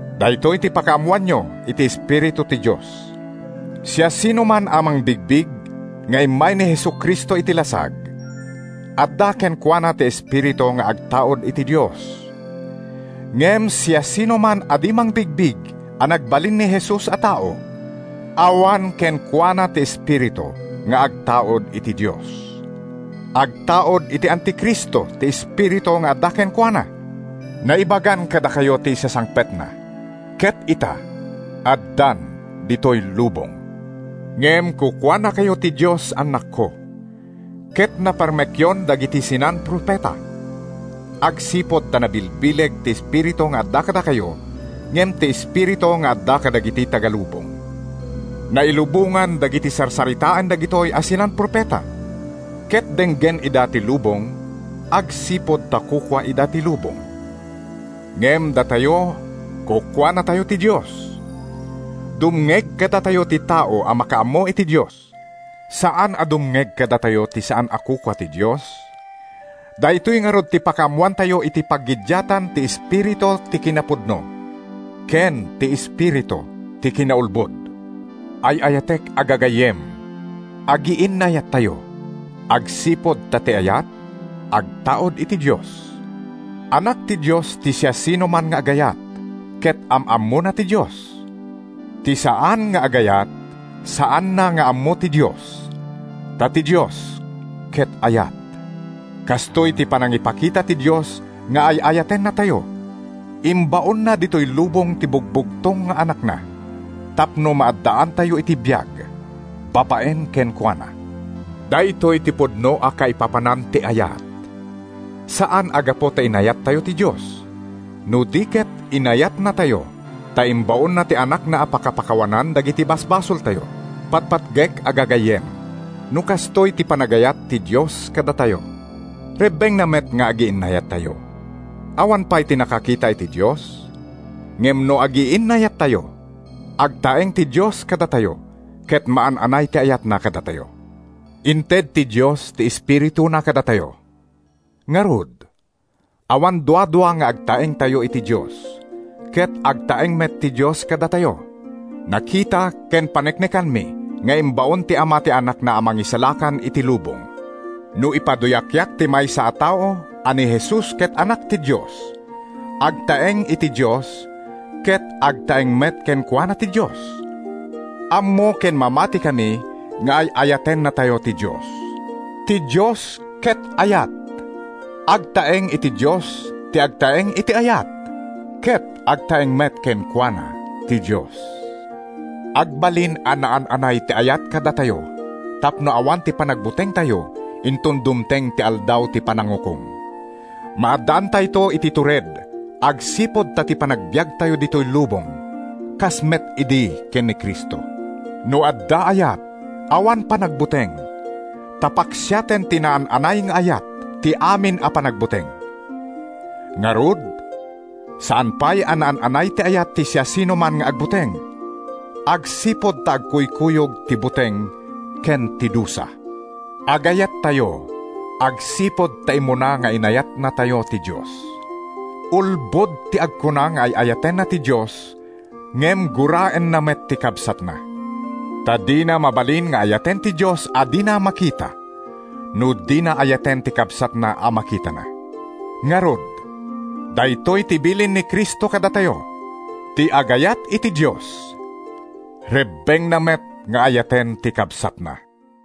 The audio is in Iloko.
Daytoy ti pakaammoanyo iti Espiritu ti Dios: Siasinoman a mangbigbig nga immay ni Jesu-Cristo iti lasag, adda kenkuana ti Espiritu nga agtaud iti Dios. Ngem siasinoman a di mangbigbig a nagbalin ni Jesus a tao, awan kenkuana ti Espiritu nga agtaud iti Dios. Agtaud iti Anti-Cristo ti espiritu nga adda kenkuana. Naibagan kadakayo ti isasangpetna ket ita addan ditoy lubong. Ngem kukuanakayo ti Dios, annakko, ket naparmekyon dagiti sinan-profeta, agsipud ta nabilbileg ti Espiritu nga adda kadakayo ngem ti espiritu nga adda kadagiti taga-lubong. Nailubongan dagiti sarsaritaen dagitoy a sinan-profeta, ket denggen ida ti lubong agsipud ta kukua ida ti lubong. Ngem datayo, kukuanatayo ti Dios. Dumngeg kadatayo ti tao a makaammo iti Dios. Saan a dumngeg kadatayo ti saan a kukua ti Dios. Daytoy ngarud ti pakaammoantayo iti paggiddiatan ti espiritu ti kinapudno ken ti espiritu ti kinaulbod. Ay-ayatek a gagayyem, agiinnayattayo, agsipud ta ti ayat agtaud iti Dios. Anak ti Dios ti siasinoman nga agayat, ket am-ammona ti Dios. Ti saan nga agayat, saanna nga ammo ti Dios, ta ti Dios ket ayat. Kastoy ti panangipakita ti Dios nga ay-ayatennatayo: Imbaonna ditoy lubong ti bugbugtong nga Anakna tapno maaddaantayo iti biag babaen kenkuana. Daytoy ti pudno a kaipapanan ti ayat: Saan a gapu ta inayattayo ti Dios, no di ket inayatnatayo, ta imbaonna ti Anakna a pakapakawanan dagiti basbasoltayo. Patpatgek a gagayyem, no kastoy ti panagayat ti Dios kadatayo, rebbengna met nga agiinnayattayo. Awan pay ti nakakita iti Dios. Ngem no agiinnayattayo, agtaeng ti Dios kadatayo ket maan-anay ti ayatna kadatayo. Inted ti Dios ti Espirituna kadatayo. Ngarud, awan duadua nga agtaengtayo iti Dios ket agtaeng met ti Dios kadatayo. Nakita ken paneknekanmi nga imbaon ti Ama ti Anakna a Mangisalakan iti lubong. No ipaduyakyak ti maysa a tao a ni Jesus ket Anak ti Dios, agtaeng iti Dios ket agtaeng met kenkuana ti Dios. Ammo ken mamatikami nga ay-ayatennatayo ti Dios. Ti Dios ket ayat! Agtaeng iti Dios ti agtaeng iti ayat, ket agtaeng met kenkuana ti Dios. Agbalin a naan-anay ti ayat kadatayo tapno awan ti panagbutengtayo inton dumteng ti Aldaw ti Panangukom. Maaddaantayto iti tured agsipud ta ti panagbiagtayo ditoy lubong kas met idi ken ni Cristo. No adda ayat, awan panagbuteng, ta paksiaten ti naan-anay nga ayat ti amin a panagbuteng. Ngarud, saan pay a naan-anay ti ayat ti siasinoman nga agbuteng, agsipud ta agkuykuyog ti buteng ken ti dusa. Agayattayo agsipud ta immuna nga inayatnatayo ti Dios. Ulbod ti agkuna nga ay-ayatenna ti Dios ngem guraenna met ti kabsatna. Ta dina mabalin nga ayaten ti Dios a dina makita, no dina ayaten ti kabsatna a makitana. Ngarud, daytoy ti bilin ni Cristo kadatayo: Ti agayat iti Dios, rebbengna met nga ayaten ti kabsatna.